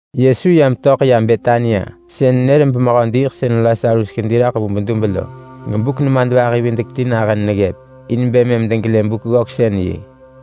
Yesu ya metöḳ ya Betania sën nër bemehö diiḳsën Lasarus kedi raḳ vu bedub lo, gebuk nemadvahi-videk-ti nahën neggëp in bë mëm degelë Buk-ggöksën-yi.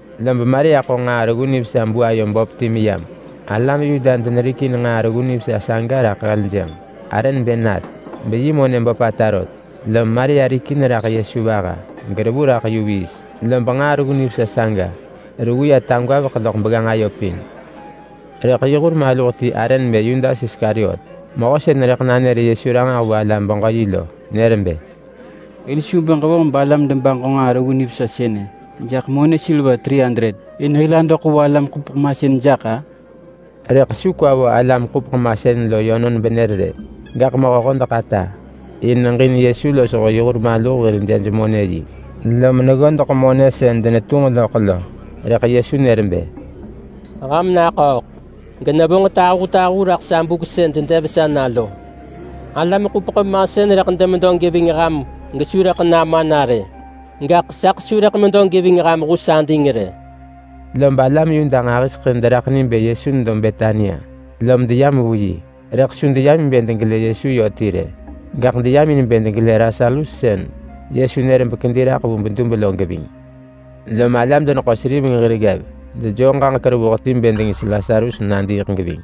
Lob Maria ḳo nġaa reggu nivesa buayo böp ti yam. Alam Yuda denerikin nġaa reggu nivesa saga raḳ heljënġ. Arë nebë nart beyi monë böpata rot. Lom Maria rikin raḳ Yesu vaha, gerevu raḳ yu viis, lob nġaa reggu nivesa saga reggu ya tagwaveḳ loḳ begganġ ayo pin. Rëḳ yi hur maluh ti arë nebë Yudas Iskariot, mehö sën rëḳ nanër Yesu ranġah vu alam-beġö-yi lo, nër bë, “Hil su bë ġevonġ balam debaġo nġaa reggu nivesa sënë jaḳ K300 in hil adoḳ vu alam-ḳupeḳ-masën jaḳ-a?” Rëḳ su kwa vo alam-ḳupeḳ-masën lo yönon benër rë. Gaḳ mehö-hodeḳ-ata! In neġin Yesu losho yi hur maluh lo hir jej-monë-yi, lom neggodeḳ monë sën denetunġ loḳ lo. Rëḳ Yesu nër bë, “Ham naḳööḳ! Genevonġ tahutahu raḳ sa buk sën dedev sa na lo. Alam-ḳupeḳ-masën rëḳ demedo geving ham gesu rëḳ nama na rë, gaḳ saḳ su rëḳ medo geving ham hus ading rë!” Lob alam Yuda nġahiseḳë deraḳ ni bë Yesu nedo Betania lom deyam vu yi. Rëḳ su deyam in bë degelë Yesu yö ti rë, gaḳ deyam in bë degelë Lasarus sën Yesu nër bekedi raḳ vu bedub lo geving. Lom alam-deneḳo-seriveng hir ggev dejoo ġaġek revuh ti bë dengis Lasarus nadiiḳ geving.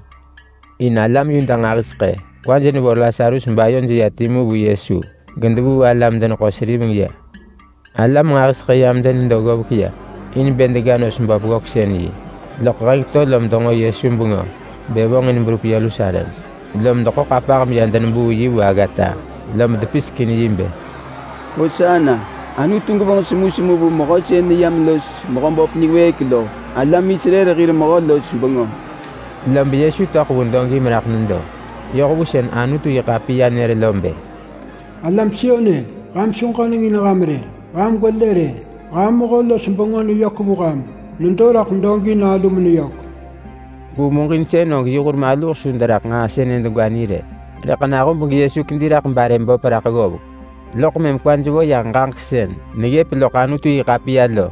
In alam Yuda nġahiseḳë kwaj nevo Lasarus bayoj ya timu vu Yesu gedevuu alam-deneḳo-seriveng ya. Alam nġahiseḳë yam denedo ggovek ya in bë dega nos böp ggöksën-yi, loḳ heng to lom denġo Yesu bengö bë vonġin berup Yerusalem. Lom deḳo ḳapah meya denebuu yi vu aggata, lob depisek in yi bë: “Hosana! Anutu gevonġ semusemu vu Mehö sën neyam los Mehöböp niwëëk lo! Alam Israel hir mehö-los-bengö!” Lob Yesu töḳ vu dogi meraḳ nedo. Yoh vu sën Anutu-yi-ḳapiya nër lo bë: “Alam Sion-e! Ham su ġöneng in ham rë! Ham gwelë rë! Ham mehö-los-bengö neyök vu ham. Nedo raḳ dogi nalu meneyök!” Vu muġinsën yi hur maluh su deraḳ nġaa sënë degwa ni rë, rëḳ nahub geYesu kedi raḳ garë böp raḳ ggovek, loḳ mëm kwaj vo yah ġaġek sën neggëp loḳ Anutu-yi-ḳapiya lo,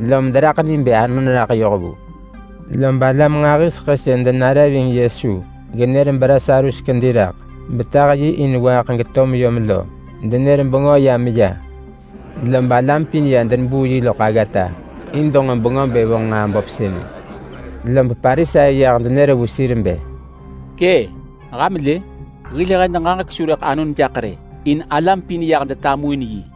lom deraḳ ni bë anon raḳ yoh vu. Lob alam nġahiseḳë sën denare ving Yesu genër beLasarus kedi raḳ betah yi in waaḳ geto meyom lo, denër bengö ya meya. Lob alam pin ya denebuu yi loḳ aggata, in denġo bengö bë vonġ nġaa böp sënë. Lob Parisai yah denër vu sir bë, “Kë’! Ham lë! Hil hed ġaġek su rëḳ anon jaḳ rë, in alam pin yah detamuin yi.”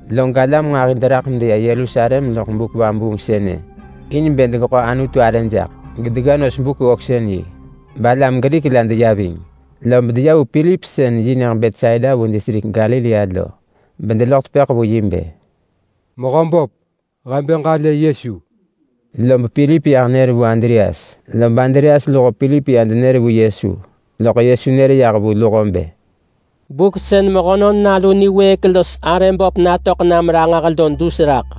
Log alam nġahi deraḳ medeya Yerusalem loḳ buk vabuung sënë in bë degeḳo Anutu arë jaḳ gedega nos Buk-ggöksën-yi. Balam Grik la deya ving, lob deya vu Pilip sën yi nyëġ Betsaida vu distrik Galilea lo bedeloḳ tepëḳ vu yi bë, “Mehö böp, he bë ġalë Yesu.” Lob Pilip ya menër vu Andreas, lob Andreas luho Pilip ya denër vu Yesu. Loḳ Yesu nër yah vu luho bë, “Buk sën Mehönon Nalu niwëëk los arë böp natöḳ nam ranġah lo dus raḳ.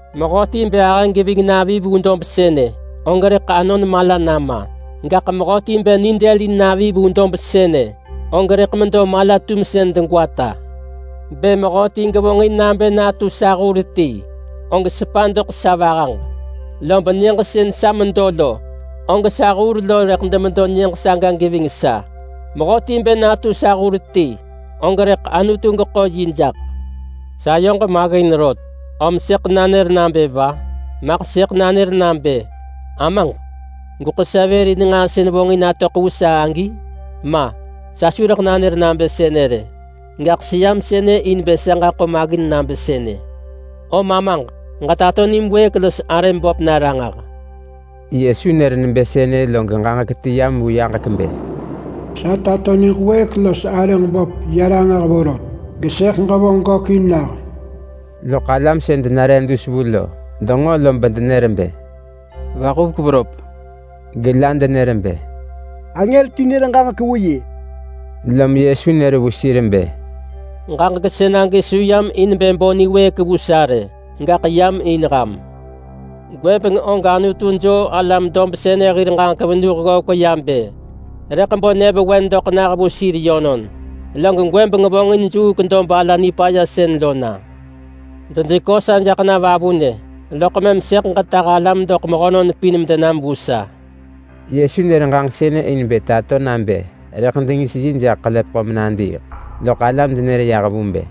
Mehöti bë ahë geving navi vu dob sënë, og rëḳ anon mala nama. Gaḳ mehöti bë nidëlin navi vu dob sënë, og rëḳ medo mala-tumsën degwata. Bë mehöti gevonġin nabë natu sa hur ti, og sepa doḳ sa vahaġ. Lob nyëġ sën sa medo lo, og sa hur lo rëḳ demedo nyëġ saga geving sa. Mehöti bë natu sa hur ti, og rëḳ Anutu geḳo yi jaḳ.” “Sayoġ maggin rot, om sëḳ nanër nabë va? Maḳ sëḳ nanër nabë, ‘Amaġ, gweḳo sa vër in nġaa sën vonġin natöḳ vu sa agi’? Ma! Sa su rëḳ nanër nabë sënë rë. Gaḳ seyam sënë in bë sa ġaḳo maggin nabë sënë. Om Amaġ, ġetato nim wëëk los arëm böp na ranġah!” Yesu nër nebë sënë log ġaġek ti yam vu yaġek bë, “Sa tato niġ wëëk los arëġ böp ya ranġah vorot, gesëḳ ġevonġ gökin nah!” Loḳ alam sën denare dus vu lo, denġo lob denër bë, “Vaḳuvek veröp!” Gela denër bë, “Angër ti nër ġaġek vu yi!” Lom Yesu nër vu sir bë, “Ġaġek sënagi su yam in bë bo niwëëk vu sa rë, gaḳ yam in ham. Gwëbeng og Anutu joo alam dob sënë hir ġaġek venuh ggovek ya bë rëḳ bo nyëvewen doḳ nah vu sir yönon. Log gwëbeng vonġin juuk dob ala nipaya sën lo na. Dejekö sa jaḳ na vavunë, loḳ mëm sëḳ ġetah alam doḳ mehönon pin medenam vu sa.” Yesu nër ġaġek sënë in bë tato nabë rëḳ dengis yi jaḳ ḳelepeḳo menadiiḳ. Loḳ alam denër yah vu bë,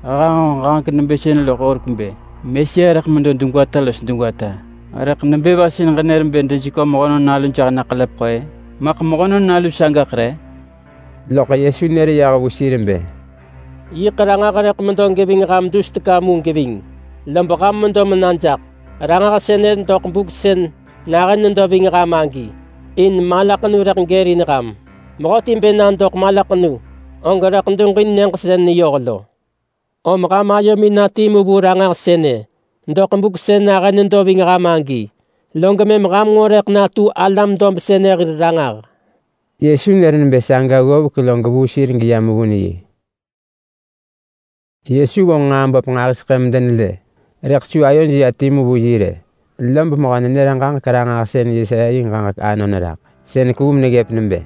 “He hanġo ġaġek nebë sënë loḳ horek bë Mesia rëḳ medo degwata los degwata. Rëḳ nebë va sën ġenër bë dejekö Mehönon Nalu jaḳ na ḳelepeḳo-ë? Maḳ Mehönon Nalu sagaḳ re?” Loḳ Yesu nër yah vu sir bë, “Yiḳ Ranġah rëḳ medo geving ham dus teka geving. Lob ham medo mena jaḳ Ranġah sënë doḳ buk sën nahën nedo ving ham agi, in malaḳenu rëḳ gërin ham. Mehöti bë na doḳ malaḳenu, og rëḳ duġin nyëġ sën neyoh lo. Om ham ayomin na timu vu Ranġah sënë doḳ buk sën nahën nedo ving ham agi, log mëm ham nġo rëḳ natu alam dob sënë hir ranġah.” Yesu nër nebë saga ggovek log vuu sir geya mevun yi. Yesu vonġ nġaa böp nġahiseḳë medenelë, rëḳ su ayoj ya timu vu yi rë, lob mehö-nenër-ġaġek-ranġahsën Yesaya yi ġaġek anon raḳ nebë sënë. Sën kevu meneggëp nebë: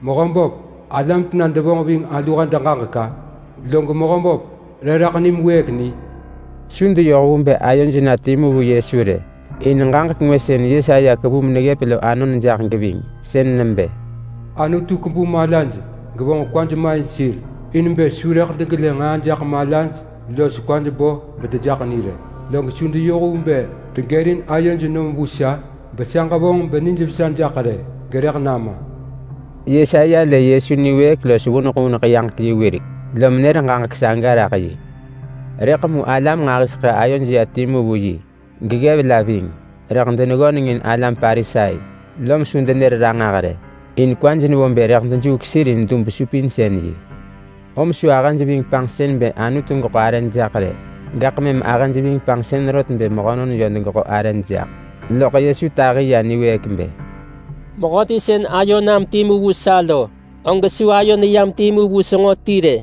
“Mehöböp, alam tena devonġ ving alu hed ġaġek-a? Log Mehöböp, re raḳ nim wëëk ni?” Su deyoh vu bë ayoj na timu vu Yesu rë, in ġaġek ngwë sën Yesaya kevu meneggëp lo anon jaḳ geving. Sën nebë: “Anutu kebu malaj, gevonġ kwaj ma in sir, in bë su rëḳ degelë nġaa jaḳ malaj los kwaj bo bedejaḳ ni rë, log su deyoh vu bë degërin ayoj nom vu sa, besa ġevonġ nijvesa jaḳ rë. Gerëḳ nama!” Yesaya lë Yesu niwëëk los vuneḳ vuneḳ yaġek yi wirek, lom nër ġaġek saga raḳ yi. Rëḳ mu alam nġahiseḳë ayoj ya timu vu yi, geggev la ving. Rëḳ deneggönengin alam Parisai, lom su denër ranġah rë, in kwaj nevo bë rëḳ dejuuk sir in dub-supinsën-yi. Om su ahëj ving panġsën bë Anutu geḳo arëj jaḳ rë. Gaḳ mëm ahëj ving panġsën rot bë mehönon yö degeḳo arëj jaḳ. Lom Yesu tahi ya ranġah bë, “Mehöti sën ayo nam timu vu sa lo, og su ayo neyam timu vu senġo ti rë.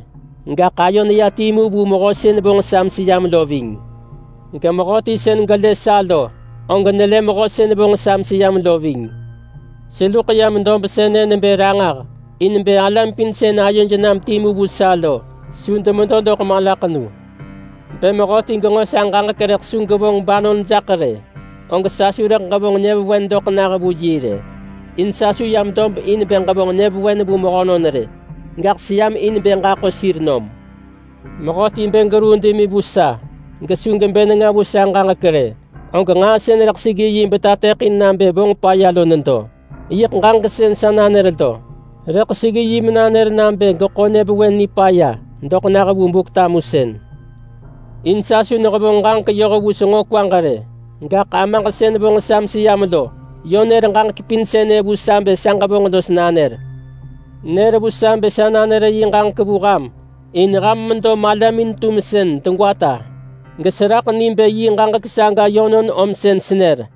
Gaḳ ayo neya timu vu Mehö sën vonġ sa meseyam lo ving. Gemehöti sën gelë sa lo, og nelë Mehö sën vonġ sa meseyam lo ving. Seluḳ yam dob sënë nebë ranġah in bë alam pin sën ayoj nam timu vu sa lo su demedo doḳ malaḳenu. Bë mehöti genġo sa ġaġek rëḳ su gevonġ banon jaḳ rë, og sa su rëḳ ġevonġ nyëvewen doḳ nah vu yi rë. In sa su yam dob in bë ġevonġ nyëvewen vu mehönon rë gaḳ seyam in bë ġaḳo sir nom. Mehöti bë geruu demi vu sa gesu gebë nenga vu sa ġaġek rë, og nġaa sën rëḳ seggi yi betateḳin nabë vonġ paya lo nedo. Yiḳ ġaġek sën sa nanër lo. Rëḳ seggi yi menanër nabë geḳo nyëvewen nipaya doḳ nah vu Buk-tamusën. In sa su nehevonġ ġaġek yoh vu senġo kwaġ rë. Gaḳ Amaġ sën vonġ sa meseyam lo, yö nër ġaġek pin sënë vu sa bë sa ġevonġ los nanër. Nër vu sa bë sa nanër yi ġaġek vu ham in ham medo malamin-tumsën degwata, geseraḳ ni bë yi ġaġek saga yönon om sën senër.”